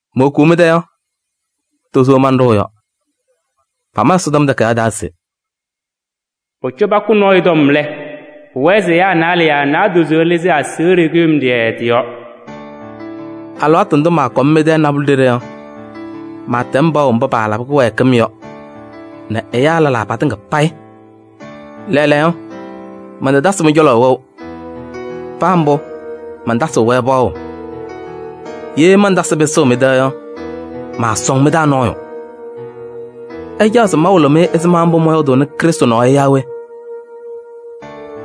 Mowokuu mɩ-tɛ yɔ, tozo manɖʋʋ yɔ. Pama Ɛsɔtɔm Takayaɣ taa se: “Pʋcɔ pakʋ nɔɔyʋ tɔm lɛ, pʋwɛɛ se ɛyaa naalɛ yaa naadozo ɩlɩzɩ aseɣɖe kʋɖʋmɖɩyɛ tɩ-yɔɔ.” Alɩwaatʋ ndʋ maakɔm mɩ-tɛ nabʋlɛ ɖeɖe yɔ, maatɛm paɣʋ mba paalabɩ kɩwɛɛkɩm yɔ nɛ ɛyaa lɛlaa tɩŋa payɩ. Lɛɛlɛɛyɔ mantatasɩ mɩ-cɔlɔ wɛʋ, paa mbʋ mantasɩɣ-wɛ paɣʋ. Ye mantasɩ pɩsʋʋ mɩ-tɛ yɔ, maasɔŋ mɩ-taa nɔɔyʋ. Ɩcaɣ se mawɩlɩ-mɩ ɛzɩma mbʋ mɔyɔɔdʋʋnɩ Krɩstʋ nɔɔ yɔ yaa we?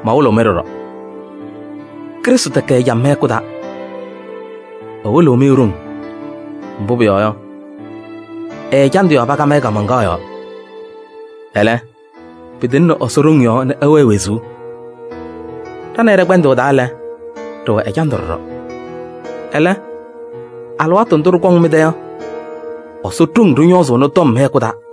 Mawɩlɩɣ-mɩ ɖɔɖɔ. Krɩstʋ tɛkɛ ɛjam mɩ-hɛkʋ taa: ɛwɩlɩɣ-mɩ e-ɖoŋ. Mbʋ pʋyɔɔ yɔ, ɛ-ɛjandʋ yɔɔ pakam-ɩ kaamaŋkaɣ yɔɔ. Ɛlɛ, pɩtɩŋnɩ Ɛsɔ ɖoŋ yɔɔ nɛ ɛwɛɛ wezuu. Ɖa nɛ ɩ ɖɛ-kpɛndʋʋ taa lɛ, ɖɩwɛ ɛjandʋ ɖɔɖɔ. Ɛlɛ, alɩwaatʋ ndʋ ɖɩkɔŋ mɩ-tɛ yɔ, Ɛsɔ ɖoŋ ɖɩñɔɔzʋʋnɩ tɔm mɩ-hɛkʋ taa.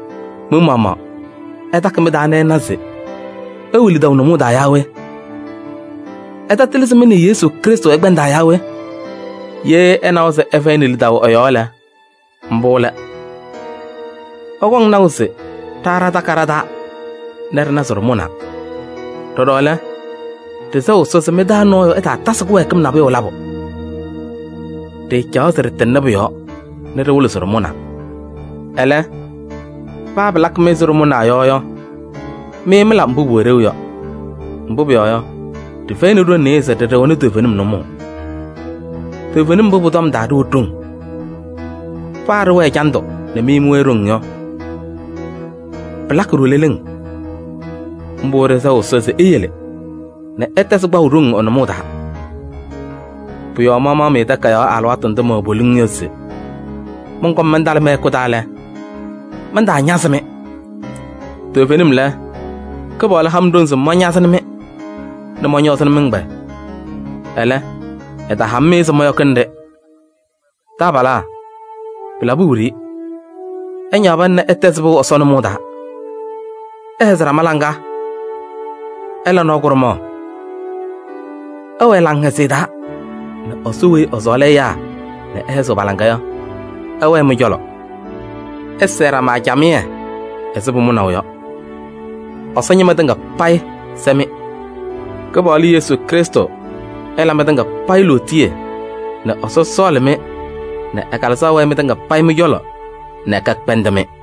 Mɩ-maɣmaɣ ɩtakɩ mɩ-taa nɛ ɩna se ɩwɛ lidaʋ nʋmɔʋ taa yaa we? Ɩtatɩlɩ se mɩ nɛ Yesu Krɩstʋ ɩkpɛndaa yaa we? Ye ɩnawa se ɩfɛyɩnɩ lidaʋ ɛ-yɔɔ lɛ, mbʋ lɛ. Ɩkɔŋ naʋ se ɖa ɖatakɩ ɖa-taa nɛ ɖɩna se ɖɩmʋnaa. Ɖɔɖɔ lɛ, ɖɩsɛɣ Ɛsɔ se mɩ-taa nɔɔyʋ ɛtaatasɩ kɩwɛɛkɩm nabʋyʋ labʋ. Ɖɩɩcaɣ se ɖɩtɩŋnɩ pʋ-yɔɔ nɛ ɖɩwɩlɩ se ɖɩmʋnaa. Ɛlɛ, paa pɩlakɩ-mɩ ɛzɩ ɖɩtamʋna yɔ yɔ, mɩ mɩla mbʋ pʋwɛ ɖeu yɔ. Mbʋ pʋyɔɔ yɔ, ɖɩfɛyɩnɩ ɖoŋ nɩɩyɩ se ɖɩɩɖɩɣnɩ toovenim nʋmɔʋ. Toovenim mbʋ pʋ-tɔm taa ɖɩwɛ ɖoŋ. Paa ɖɩwɛ ɛjandʋ nɛ mɩ mɩwɛɛ ɖoŋ yɔ, pɩlakɩ-ɖʋ leleŋ. Mbʋ ɖɩsɛɣ Ɛsɔ se eyele nɛ ɩtɛzɩ kpaʋ ɖoŋ ɛ-nʋmɔʋ taa. Pʋ-yɔɔ mamaɣ-mɩ takayaɣ alɩwaatʋ ndʋ mɛwɛ poliŋ yɔ se mɔnkɔm mantalɩ mɩ-hɛkʋ taa lɛ, mantaañazɩ-mɩ. Toovenim lɛ, Kɩpaɣlʋ ha-m ɖoŋ se mañazɩnɩ-mɩ nɛ mɔñɔɔzɩnɩ mɩ-ɛgbɛyɛ. Ɛlɛ, ɛtaha-m-ɩ se mɔyɔkɩnɩ-ɖɩ. Taabalaa, pɩlabɩ wiɖiyi! Ɩñaɣ pana nɛ ɩtɛzɩ pɩʋ Ɛsɔ nʋmɔʋ taa. Ɩhɛzɩ ɖama laŋa. Ɩla nɔɔ kʋɖʋmaɣ. Ɩwɛɛ laŋhɛzɩyɛ taa nɛ Ɛsɔ weyi ɛsɔɔlɩ ɛyaa nɛ ɛhɛzɩɣ pa-laŋa yɔ, ɛwɛɛ mɩ-cɔlɔ. Ɩsɛɛ ɖama camɩyɛ ɛzɩ pʋmʋnaʋ yɔ. Ɛsɔ ñɩma tɩŋa payɩ sɛ-mɩ. Kɩpaɣlʋ Yesu Krɩstʋ ɛla mɩtɩŋa payɩ lootiye nɛ Ɛsɔ sɔɔlɩ-mɩ nɛ ɛ-Kalɩzaɣ wɛɛ mɩtɩŋa payɩ mɩ-cɔlɔ nɛ kɛkpɛndɩ-mɩ.